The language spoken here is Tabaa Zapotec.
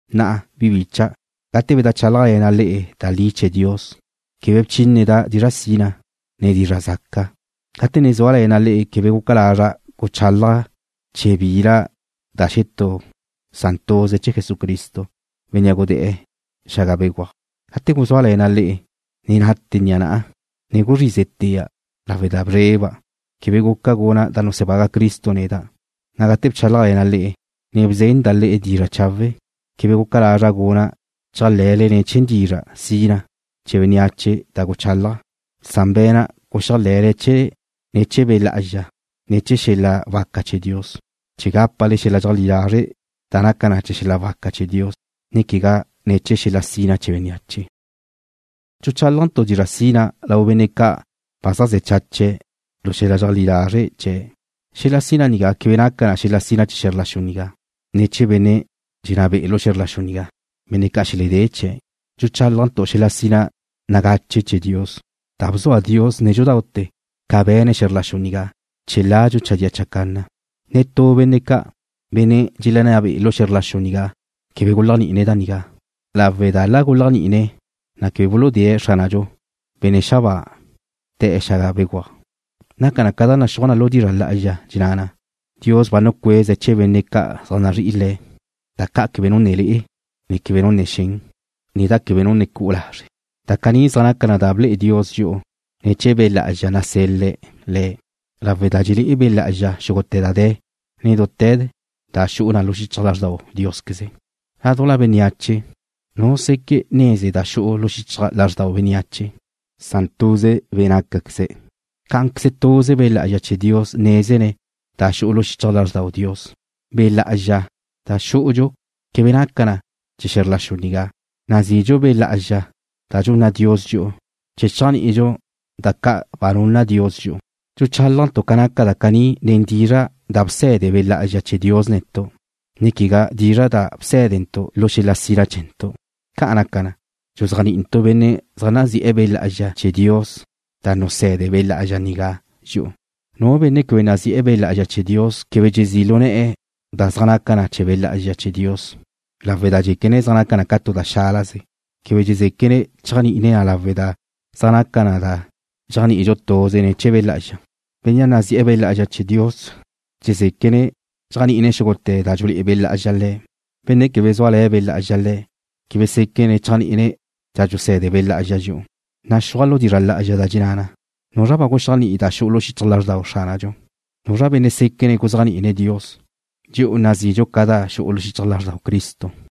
Na'a, bi bícha'dau', gate bedajchálajle̱na' le'e da li chee̱ Dios, quebe bchíneda' dizra' sina, ne dizra' zaca. Gate ne zúale̱na' le'e quebe guca lazra' guchálaja' chee̱ bila da xetú san tuze chee̱ Jesucristo, Bénnea' gudé̱'e̱ xaga béguaj. Gate guzúale̱na' le'e ne nátete̱ ni'a na'a, ne guzrízetea' lawe' da bzreba' quebe guca guna' da nusebaga' Cristo neda'. Gate bchálajle̱na' le'e, ne bzenda' le'e dizra' chawe', quebe guca lazra' guna' chéajle̱le chee̱' nen dizra' sina chee̱ bénneache da guchálaja', san be̱na' guxéajle̱le chee̱' ne̱ chee̱ Be' Lá'azxa, ne ne̱ chee̱ xel-la waca chee̱ Dios chee̱ gápale xel-la dxeajlí lazre' da naca na ne̱ chee̱ xel-la waca chee̱ Dios, ne quegá ne̱ chee̱ xel-la sina chee̱ bénneache. Dxuchálajntu' dizra' sina lau benne' ca' ba zaj ze̱ chache̱' lu xel-la dxeleajlí lazre' chee̱'. Xel-la sina nigá quebe naca na xel-la sina chee̱ xe̱zr la xu nigá, ne chee̱ benne' dxelenná be'e̱ lu xe̱zr la xu nigá, benne' ca' xeledé chie̱'. Dxuchálajntu' xel-la sina nagache chee̱ Dios, da na' bzua Dios nédxudaute̱ ca be̱ne̱' xe̱zr la xu nigá, chee̱ ladxu chadía chacanna. Netú benne' ca', benne' dxelenná be'e̱ lu xe̱zr la xu nigá, quebe guléajni'ine̱' da nigá, lawe' da la guléajni'ine̱' na quebe buludé̱'e̱ Xránadxu, Benne' xabáa, le̱'e xaga béguaj. Naca na ca da naxúaj na lu dizra' lá'azxa, dxenná na: Dios ba nucueze̱' chee̱ benne' ca' zaj nazrí'ine̱' Le̱' da ca' quebe nu ne le'e, ne quebe nu ne xen, ne da quebe nu ne cu'u lazre'. Da caní zaj naca na da ble'e Dios dxi'u ne̱ chee̱ Be' Lá'azxa nasel-la Le̱', lawe' da dxelé'e Be' Lá'azxa xúgute̱ da de̱, ne dute̱ da xu'u na lu xichaj lázrdau Diósqueze. Ládujla bénneache, ¿nu seque' neze da xu'u lu xichaj lázrdau xetú benne', san tuze be' da nacaque̱ze̱'? Cá'anqueze, tuze Be' Lá'azxa chee̱ Dios nézene̱' da xu'u lu xichaj lázrdau Dios. Be' Lá'azxa da xú'udxu quebe naca na chee̱ xe̱zr la xu nigá. Nazidxu Be' Lá'azxa da dxunna Dios dxi'u chee̱ chéajni'idxu da ca' ba nunna Dios dxi'u. Dxuchálajntu' ca naca da caní nen dizra' da bse̱de Be' Lá'azxa chee̱ Dios netu', ne quegá nen dizra' da bsé̱dentu' lu xel-la sina chee̱ntu'. Ca' naca na, dxuzéajni'intu' benne' zaj nazi'e̱ Be' Lá'azxa chee̱ Dios da nuse̱de Be' Lá'azxa nigá dxi'u. Nu benne' quebe nazi'e̱ Be' Lá'azxa chee̱ Dios quebe dxezí' lu ne̱'e̱ da zaj naca na chee̱ Be' Lá'azxa chee̱ Dios, lawe' da dxéquene̱' zaj naca na tu da xálaze. Quebe dxezeque' chéajni'ine̱' na lawe' da zaj naca na da dxéajni'idxu tuze ne̱ chee̱ Be' Lá'azxa. Bénnea' nazi'e̱ Be' Lá'azxa chee̱ Dios dxezéquene̱' chéajni'ine̱' xúgute̱ da dxulé'e Be' Lá'azxa le̱'. Benne' quebe zúale̱ Be' Lá'azxa le̱', quebe séquene̱' chéajni'ine̱' da dxusé̱de Be' Lá'azxa dxi'u. Naxúaj lu dizra' lá'azxa da dxenná na: ¿Nuzra ba guxéajni'i da xu'u xichaj lázrdau Xránadxu? ¿Nuzra benne' séquene̱' guzéajni'ine̱' Dios? Dxi'u nazidxu ca da xu'u xichaj lázrdau Cristo.